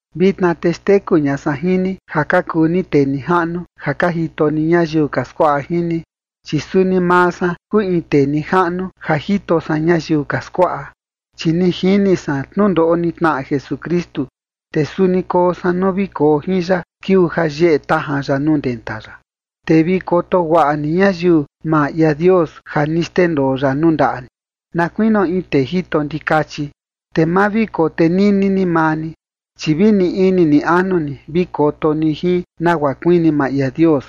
Vitna te xteku ña san jin ni ja ka kuu ni tee nijaꞌnu ja ka jito ni ñayiu ka skuaꞌa jin ni, chi suni maa san kuu in tee nijaꞌnu ja jito san ñayiu ka skuaꞌa, chi ni jini san tnundoꞌo ni tnaꞌa Jesukristu, te suni koo san nuu vi koo jin ya kiuu ja yeꞌe tajan ya nuu ndenta ya. Te vi koto guaꞌa ni ñayiu maa ia Dios ja ni xndendoo ya nuu ndaꞌa ni, na kuinio in tee jito ndikachi. Te ma vi kotenini ni maa ni, chi vi ni ini ni anu ni vi koto ni jin, nagua kuini maa ia Dios.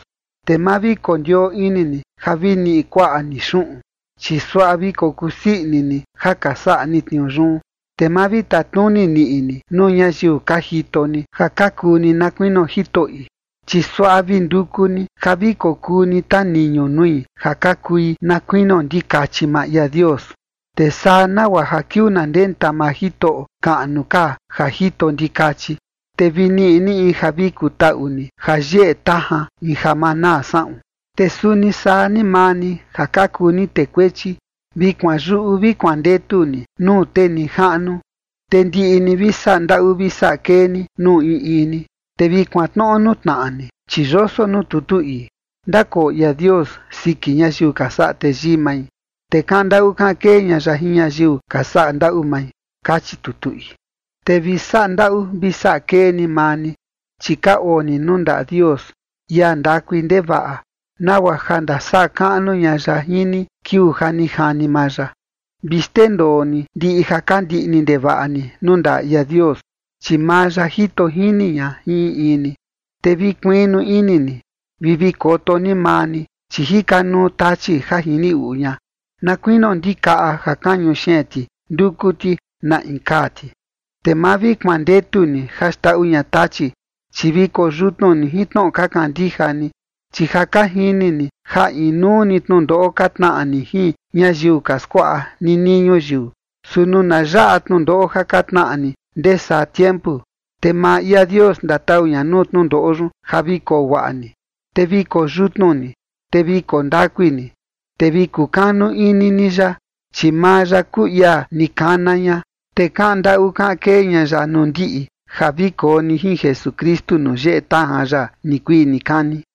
Te ma vi kondioo ini ni ja vi niꞌi kuaꞌa ni xuꞌun, chi suaꞌa vi kokusii ini ni ja ka saꞌa ni tniuu yun. Te ma vi tatnuni niꞌi ni nuu ñayiu ka jito ni ja ka kuu ni na kuinio jitoꞌi, chi suaꞌa vi nduku ni ja vi kokuu ni taniñu nui ja ka kui na kuinio ndikachi maa ia Dios. Te saa nagua ja kiuu na ndenta maa Jitoꞌo kaꞌnu ka ja jito ndikachi, te vi niꞌi ni in ja vi kutaꞌu ni ja yeꞌe tajan, in ja ma naa saꞌun. Te suni saa ni maa ni ja ka kuu ni tee kuechi, vi kuanyuꞌu vi kuandetu ni nuu tee nijaꞌnu. Te ndiꞌi ni vi saꞌa ndaꞌu vi saꞌa kee ni nuu in in ni, te vi kuantnoꞌo nuu tnaꞌa ni, chi yoso nuu tutu ii: Ndakoo ia Dios siki ñayiu ka saꞌa teyii mai, te kaꞌan ndaꞌu kaꞌan kee ña ya jin ñayiu ka saꞌa ndaꞌu mai. Kachi tutu ii. Te vi saꞌa ndaꞌu vi saꞌa kee ni maa ni, chi ka oo ni nuu ndaꞌa Dios, ia ndakui ndevaꞌa, nagua ja ndasaꞌa kaꞌnu ña ya jin ni kiuu ja ni jani maa ya. Vi xndendoo ni ndiꞌi ja ka ndiꞌni ndevaꞌa ni nuu ndaꞌa ia Dios, chi maa ya jito jini ña jin in in ni. Te vi kuiꞌnu ini ni vi vi koto ni maa ni, chi jika nuu Tachi ja jini uꞌu ña, na kuinio ndikaꞌa ja kañu xeen ti nduku ti na in kaa ti. Te ma vi kuandetu ni ja xndaꞌu ña Tachi, chi vi koyutnu ni jin tnoꞌo ka kandija ni, chi ja ka jini ni ja inuu ni tnundoꞌo ka tnaꞌa ni jin ñayiu ka skuaꞌa ninii ñuyiu. Su nuu na yaꞌa tnundoꞌo ja ka tnaꞌa ni ndee saa tiempu, te maa ia Dios ndatau ña nuu tnundoꞌo yun ja vi koo guaꞌa ni, te vi koo yutnu ni, te vi koo ndakui ni, te vi kukanu ini ni ya, chi maa ya kuu ia ni kana ña, te kaꞌan ndaꞌu kaꞌan kee ña ya nuu ndiꞌi ja vi koo ni jin Jesukristu nuu yeꞌe tajan ya nikuii nikani.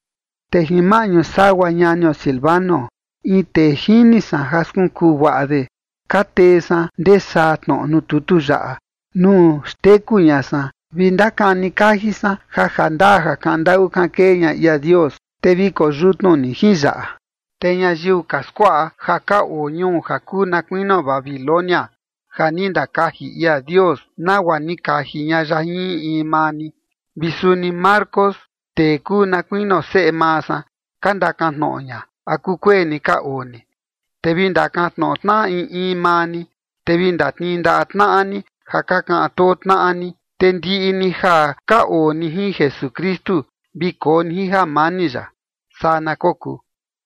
Te jin maꞌñu sagua ñanio Silvano, in tee jini san ja skunkuu guaꞌa de, ka tee san ndee saa tnoꞌo nuu tutu yaꞌa, nuu xteku ña san, vi ndakani kaji san ja jandaa ja kaꞌan ndaꞌu kaꞌan kee ña ia Dios. Te vi koyutnu ni jin yaꞌa. Te ñayiu ka skuaꞌa ja ka oo ñuu ja kuu na kuinio Babilonia ja ni ndakaji ia Dios nagua ni kaji ña ya jin in in maa ni. Vi suni Marcos, tee kuu na kuinio seꞌe maa san, ka ndakan tnoꞌo ña, ¿a kukueni ka oo ni? Te vi ndakantnoꞌo tnaꞌa in in maa ni, te vi ndatnii ndaꞌa tnaꞌa ni ja ka kaꞌan too tnaꞌa ni. Te ndiꞌi ni ja ka oo ni jin Jesukristu vi koo ni jin jamani ya. Saa na kokuu.